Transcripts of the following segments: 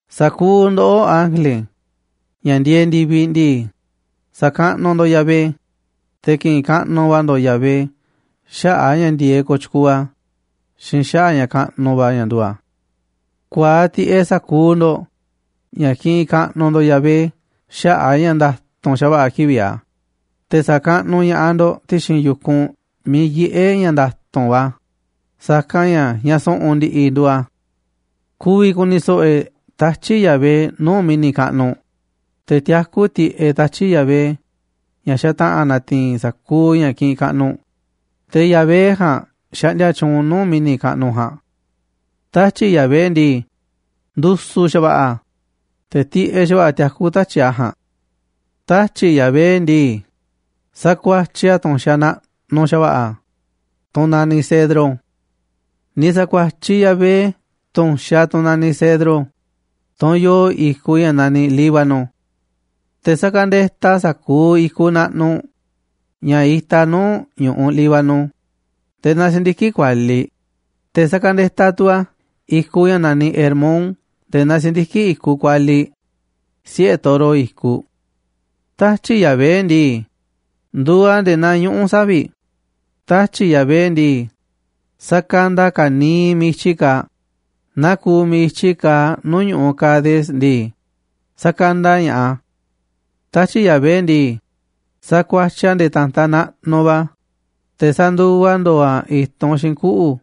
Sa̱kuuꞌ ndoꞌó, ángele, ña̱ ndieeꞌ ndi̱viꞌ ndii, sa̱kaꞌnuꞌ ndo̱ꞌ Yahvé, te̱ ki̱ꞌi̱n kaꞌnuꞌ va̱ ndo̱ꞌ Yahvé xaꞌa̱ꞌ a̱ ña̱ ndi̱e̱eꞌ kooꞌ tyukuuꞌ a̱ xiinꞌ xaꞌa̱ꞌ a̱ ña̱ kaꞌnuꞌ va̱ ña̱ nduuꞌ a̱. Ku̱a̱aꞌ tiꞌeꞌ sa̱kuuꞌ ndo̱ꞌ ña̱ kiꞌinꞌ kaꞌnuꞌ ndo̱ꞌ Yahvé xaꞌa̱ꞌ a̱ ña̱ nda̱tu̱nꞌ xa̱va̱ꞌa̱ kivi̱ꞌ a̱, te̱ sa̱kaꞌnuꞌ ña̱ꞌaꞌ ndo̱ꞌ ti̱xi̱n yu̱kunꞌ miiꞌ yiꞌé ña̱ nda̱tu̱nꞌ va̱ a̱, sa̱kanꞌ ña̱ ña̱ su̱ꞌu̱n ndi̱ꞌi̱ nduuꞌ a̱. Ku̱vi̱ ku̱ni̱ so̱ꞌo̱ e̱ꞌ tatyi̱ꞌ Yahvé nuu̱ꞌ mi̱ni̱ kaꞌnuꞌ, te̱ tiakú tiꞌeꞌ tatyi̱ꞌ Yahvé, ña̱ xataꞌa̱n na̱ti̱i̱n sa̱kuuꞌ ña̱ kiꞌinꞌ kaꞌnuꞌ, te̱ Yahvé ja̱a̱nꞌ xaꞌndia tyuunꞌ nuu̱ꞌ mi̱ni̱ kaꞌnuꞌ ja̱a̱nꞌ. Tatyi̱ꞌ Yahvé ndii, ndu̱su̱ xa̱va̱ꞌa̱ a̱, te̱ tiꞌeꞌ xa̱va̱ꞌa̱ tiakú tatyi̱ꞌ a̱ ja̱a̱nꞌ. Tatyi̱ꞌ Yahvé ndii, sakuatyiꞌ a̱ tu̱nxaꞌ naꞌnuꞌ xa̱va̱ꞌa̱, tunꞌ naniꞌ cedro. Ni̱ sa̱kuatyiꞌ Yahvé tu̱nxaꞌ, tunꞌ naniꞌ cedro, tunꞌ yoo i̱kuꞌ ña̱ naniꞌ Líbano. Te̱ sakandetaꞌ a̱ sa̱kuuꞌ i̱kuꞌ naꞌnuꞌ ña̱ itaꞌ nuu̱ꞌ ñu̱ꞌuꞌ Líbano nde̱e̱ naa si̱ndiki̱ꞌ kualiꞌ, te̱ sakandetaꞌ tu̱ a̱ i̱kuꞌ ña̱ naniꞌ Hermón nde̱e̱ naa si̱ndiki̱ꞌ i̱kuꞌ kualiꞌ, siꞌe̱ toro i̱kuꞌ. Tatyi̱ꞌ Yahvé ndii, nduuꞌ a̱ nde̱e̱ naa ñuꞌu̱ savi̱ꞌ. Tatyi̱ꞌ Yahvé ndii, sakanda a̱ ka̱niiꞌ miiꞌ i̱tyi kaaꞌ, naa kuuꞌ miiꞌ i̱tyi kaaꞌ nuu̱ꞌ ñu̱ꞌuꞌ Cades ndii, sakanda ña̱ꞌaꞌ a̱. Tatyi̱ꞌ Yahvé ndii, sakuatyiꞌ a̱ nde̱e̱ ta̱ntaꞌ naꞌnuꞌ va̱, te̱ sa̱nduva ndo̱o̱ a̱ i̱tunꞌ xiinꞌ kuꞌu̱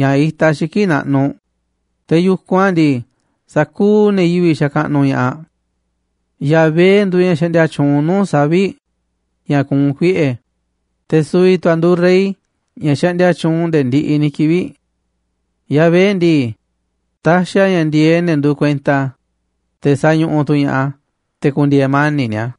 ña̱ itaꞌ xiki̱ꞌ naꞌnuꞌ, te̱ yu̱kunꞌ a̱ ndii, sa̱kuuꞌ ne̱ yivi̱ꞌ xakaꞌnuꞌ ña̱ꞌaꞌ. Yahvé nduuꞌ ña̱ xaꞌndia tyuunꞌ nuu̱ꞌ savi̱ꞌ, ña̱ kuunꞌ kuieꞌe̱, te̱ su̱vi̱ tu̱ a̱ nduuꞌ rey ña̱ xaꞌndia tyuunꞌ nde̱e̱ ndiꞌiꞌ ni̱ kivi̱ꞌ. Yahvé ndii, taxiꞌ a̱ ña̱ ndi̱e̱eꞌ ne̱ nduuꞌ kuenta a̱, te̱ sañuꞌuꞌ tu̱ ña̱ꞌaꞌ a̱ te̱ ku̱ndi̱e̱e̱ mani̱ꞌ ni̱a̱.